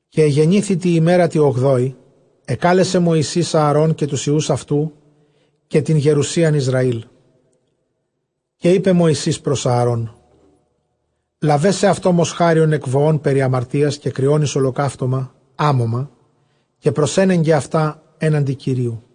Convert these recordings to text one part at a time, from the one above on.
Καὶ ἐγενήθη τῇ ἡμέρᾳ τῇ ὀγδόῃ, ἐκάλεσε Μωυσῆς Ἀαρὼν, καὶ τοὺς υἱοὺς αὐτοῦ, καὶ τὴν γερουσίαν Ἰσραὴλ, καὶ εἶπε Μωυσῆς πρὸς Ἀαρών, λάβε σεαυτῷ μοσχάριον ἐκ βοῶν περὶ ἁμαρτίας, καὶ κριὸν εἰς ὁλοκαύτωμα, ἄμωμα, καὶ προσένεγκε αὐτὰ ἔναντι Κυρίου.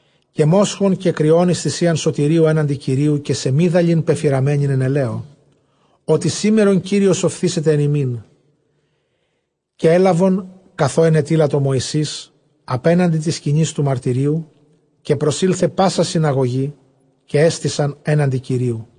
καὶ μόσχον, καὶ κριὸν εἰς θυσίαν σωτηρίου ἔναντι Κυρίου, καὶ σεμίδαλιν πεφυραμένην ἐν ἐλαίῳ· ὅτι σήμερον Κύριος ὀφθήσεται ἐν ὑμῖν. Καὶ ἔλαβον καθὸ ἐνετείλατο Μωυσῆς ἀπέναντι τῆς σκηνῆς τοῦ μαρτυρίου· καὶ προσῆλθε πᾶσα συναγωγὴ, καὶ ἔστησαν ἔναντι Κυρίου.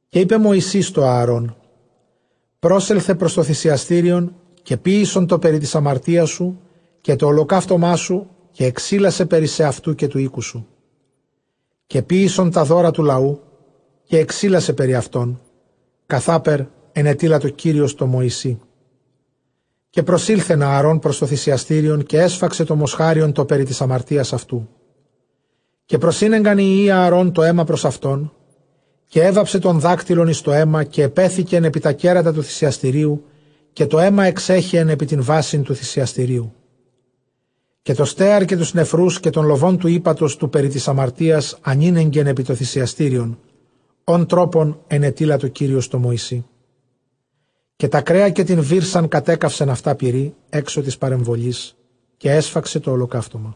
Καὶ εἶπε Μωυσῆς τῷ Ἀαρὼν, πρόσελθε πρὸς τὸ θυσιαστήριον, καὶ ποίησον τὸ περὶ τῆς ἁμαρτίας σου, καὶ τὸ ὁλοκαύτωμά σου, καὶ ἐξίλασαι περὶ σεαυτοῦ, καὶ τοῦ οἴκου σου· καὶ ποίησον τὰ δῶρα τοῦ λαοῦ, καὶ ἐξίλασαι περὶ αὐτῶν, καθάπερ ἐνετείλατο Κύριος τῷ Μωυσῇ. Καὶ προσῆλθεν Ἀαρὼν πρὸς τὸ θυσιαστήριον, καὶ ἔσφαξε τὸ μοσχάριον τὸ περὶ τῆς ἁμαρτίας αὐτοῦ. Καὶ προσήνεγκαν οἱ υἱοὶ Ἀαρὼν τὸ αἷμα πρὸς αὐτόν· καὶ ἔβαψε τὸν δάκτυλον εἰς τὸ αἷμα, καὶ ἐπέθηκεν ἐπὶ τὰ κέρατα τοῦ θυσιαστηρίου· καὶ τὸ αἷμα ἐξέχεεν ἐπὶ τὴν βάσιν τοῦ θυσιαστηρίου. Καὶ τὸ στέαρ καὶ τοὺς νεφροὺς καὶ τὸν λοβὸν τοῦ ἥπατος τοῦ περὶ τῆς ἁμαρτίας ἀνήνεγκεν ἐπὶ τὸ θυσιαστήριον, ὃν τρόπον ἐνετείλατο Κύριος τῷ Μωυσῇ. Καὶ τὰ κρέα καὶ τὴν βύρσαν κατέκαυσεν αὐτὰ πυρὶ, ἔξω τῆς παρεμβολῆς. Καὶ ἔσφαξε τὸ ὁλοκαύτωμα·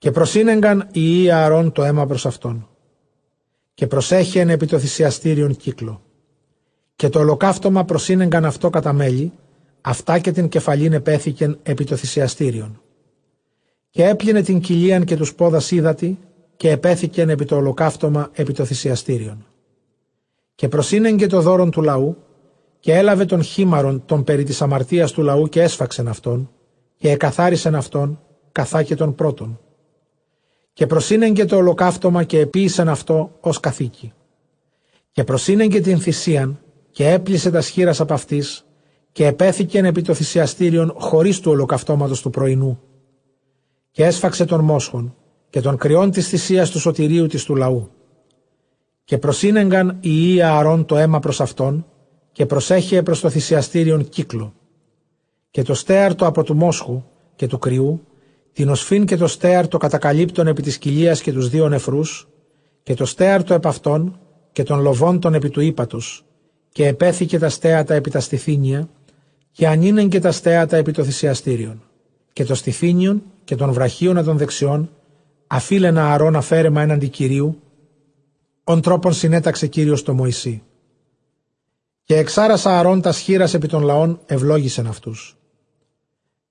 καὶ προσήνεγκαν οἱ υἱοὶ Ἀαρὼν τὸ αἷμα πρὸς αὐτόν· καὶ προσέχεεν ἐπὶ τὸ θυσιαστήριον κύκλῳ. Καὶ τὸ ὁλοκαύτωμα προσήνεγκαν αὐτὸ κατὰ μέλη· αὐτὰ καὶ τὴν κεφαλὴν ἐπέθηκεν ἐπὶ τὸ θυσιαστήριον. Καὶ ἔπλυνε τὴν κοιλίαν καὶ τοὺς πόδας ὕδατι· καὶ ἐπέθηκεν ἐπὶ τὸ ὁλοκαύτωμα ἐπὶ τὸ θυσιαστήριον. Καὶ προσήνεγκε τὸ δῶρον τοῦ λαοῦ, καὶ ἔλαβε τὸν χίμαρον τὸν περὶ τῆς ἁμαρτίας τοῦ λαοῦ, καὶ ἔσφαξεν αὐτὸν, καὶ ἐκαθάρισεν αὐτὸν, καθὰ καὶ τὸν πρῶτον. Καὶ προσήνεγκε τὸ ὁλοκαύτωμα, καὶ ἐποίησεν αὐτὸ ὡς καθήκει. Καὶ προσήνεγκε τὴν θυσίαν, καὶ ἔπλησε τὰς χεῖρας ἀπʼ αὐτῆς, καὶ ἐπέθηκεν ἐπὶ τὸ θυσιαστήριον χωρὶς τοῦ ὁλοκαυτώματος τοῦ πρωϊνοῦ. Καὶ ἔσφαξε τὸν μόσχον, καὶ τὸν κριὸν τῆς θυσίας τοῦ σωτηρίου τῆς τοῦ λαοῦ· καὶ προσήνεγκαν οἱ υἱοὶ Ἀαρὼν τὸ αἷμα πρὸς αὐτόν, καὶ προσέχεε πρὸς τὸ θυσιαστήριον κύκλῳ, καὶ τὸ στέαρ τὸ ἀπὸ τοῦ μόσχου, καὶ τοῦ κριοῦ τὴν ὀσφὺν, καὶ τὸ στέαρ τὸ κατακαλύπτον ἐπὶ τῆς κοιλίας, καὶ τοὺς δύο νεφροὺς, καὶ τὸ στέαρ τὸ ἐπʼ αὐτῶν, καὶ τὸν λοβὸν τὸν ἐπὶ τοῦ ἥπατος. Καὶ ἐπέθηκε τὰ στέατα ἐπὶ τὰ στηθύνια καὶ ἀνήνεγκε τὰ στέατα ἐπὶ τὸ θυσιαστήριον. Καὶ τὸ στηθύνιον, καὶ τὸν βραχίονα τὸν δεξιὸν ἀφεῖλεν Ἀαρὼν ἀφαίρεμα ἔναντι Κυρίου, ὃν τρόπον συνέταξε Κύριος τῷ Μωυσῇ. Καὶ ἐξάρας Ἀαρὼν τὰς χεῖρας ἐπὶ τὸν λαὸν, εὐλόγησεν αὐτούς·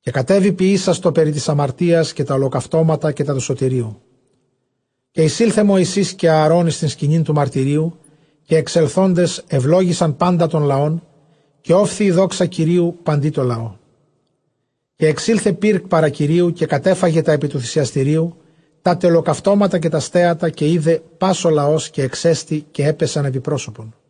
καὶ κατέβη ποιήσας τὸ περὶ τῆς ἁμαρτίας, καὶ τὰ ὁλοκαυτώματα, καὶ τὰ τοῦ σωτηρίου. Καὶ εἰσῆλθε Μωυσῆς καὶ Ἀαρὼν εἰς τὴν σκηνὴν τοῦ μαρτυρίου· καὶ ἐξελθόντες εὐλόγησαν πάντα τὸν λαὸν· καὶ ὤφθη δόξα Κυρίου παντὶ τῷ λαῷ. Καὶ ἐξῆλθε πῦρ παρὰ Κυρίου, καὶ κατέφαγε τὰ ἐπὶ τοῦ θυσιαστηρίου, τά τε ὁλοκαυτώματα, καὶ τὰ στέατα· καὶ εἶδε πᾶς ὁ λαὸς, καὶ ἐξέστη, καὶ ἔπεσαν ἐπὶ πρόσωπον.